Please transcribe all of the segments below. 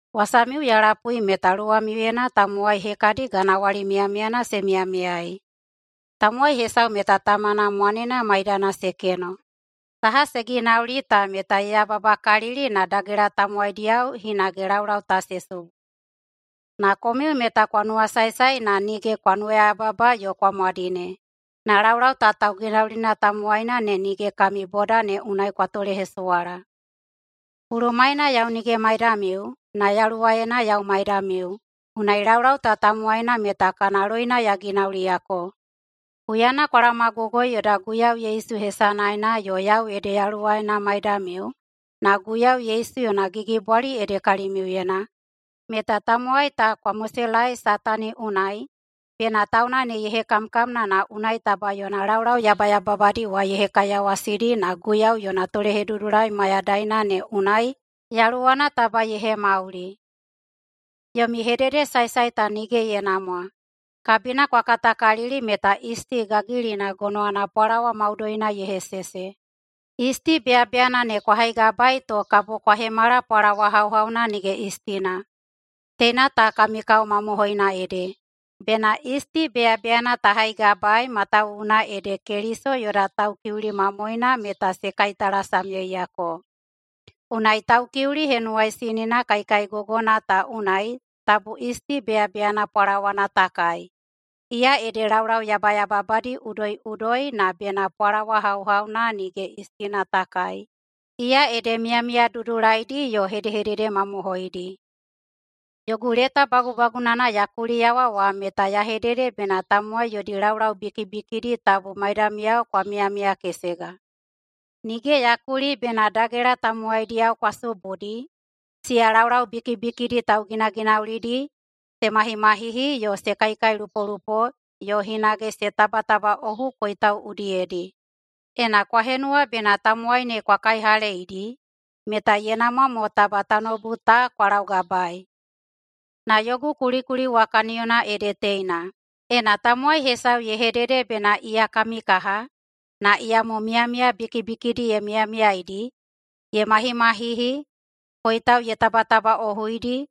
Wasamiu ya lapui meta luwamiuyena tamowai hekadi ganawali miyamiyana se miyamiyaei. Tamowai hesau meta tamana mwanena maidana se keno. Saha se ginauli ta meta ye yababakalili na dagela tamowaidiyao hinage laulau ta se subu. Na komiu meta kwa nuwasaesae na nige kwa nuwayababa yo kwa mwadine, na laulau ta tauginaulina tamowaina ne nige kami boda ne unai kwa tolehesuwala. Bulumaena yau nige maidamiu, na yaluwaena yau maidamiu, unai laulau ta tamowaina meta kana loina ya ginauliyako. Huyana kwa laomagogoi yoda Guiyau Yesu hesanaena yo yau ede yaluwaena maidamiu na Guiyau Yesu yona gigibwali ede kalimiuyena, meta tamowai ta kwa moselaei Satani unai, bena tauna ne ye hekamkamna na unai taba yona laulau yabayababadi wa ye hekaiyawasidi na Guiyau yona tolehedudulai mayadaina ne unai yaluwana taba ye hemauli. Yomi hedehededesaesae ta nige ye namwa. Kabina kwa katakalili meta yisti gagilina gonowana pwalawa maudoina ye hesese. Yisti beyabeyana ne kwa haigabaei to kabo kwa hemala pwalawa hauhauna nige yistina. Teina ta kami kao mamohoina ede! Bena yisti beyabeyana ta haigabaei matawuwuna ede Keliso yoda Taukiuli mamoena meta se kaitalasamyeiyako. Unai Taukiuli Henuwaisinina kaikaigogona ta unai tabu yisti beyabeyana pwalawana ta kai, iya ede laulau yabayababadi udoiꞌudoidi, na bena pwalawa hauhauna nige yistina ta kai, iya ede miyamiya dudulaidi yo hedehedede mamohoidi. Yogu leta bagubagunana ya kuliyawa wa meta ya hedede bena tamowai yodi laulau bikibikidi tabu maidamiyao kwa miyamiyakesega. Nige ya kuli bena dagela tamowaidiyao kwa subudi, siya laulau bikibikidi tauginaginaulidi, se mahimahihi yo se kaikailupolupo yo hinage se tabatabaꞌohu koitau udiyedi. Ena kwa henuwa bena tamowai ne kwa kaihaleidi, meta ye namwa mo taba tanoubu ta kwa laugabaei. Na yogu kulikuli wa kaniyona ede teina: Ena tamowai hesau ye hedede bena iya kami kaha, na iyamo miyamiya bikibikidi ye miyamiyaeidi, ye mahimahihi, koitau ye tabatabaꞌohuidi,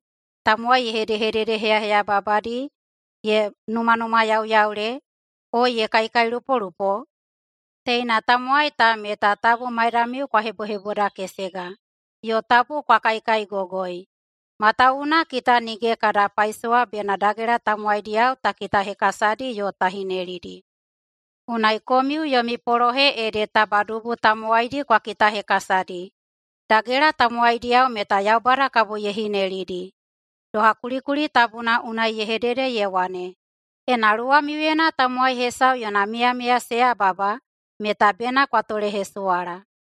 tamowai ye hedehededeheyaheyababadi, ye numanumayauyaule, o ye kaikailupolupo, teina tamowai ta meta tabu maidamiu kwa hebohebodakesega, yo tabu kwa kaikaigogoi. Matawuwuna kita nige kada paisowa bena dagela tamowaidiyao ta kitahekasadi yo ta hinelidi. Unai komiu yomi polohe ede taba dubu tamowaidi kwa kitahekasadi. Dagela tamowaidiyao meta Yaubada kabo ye hinelidi. Doha kulikuli tabuna unai ye hedede ye wane, “Ena luwamiuyena tamowai hesau yona miyamiya se yababa meta bena kwa tolehesuwala.”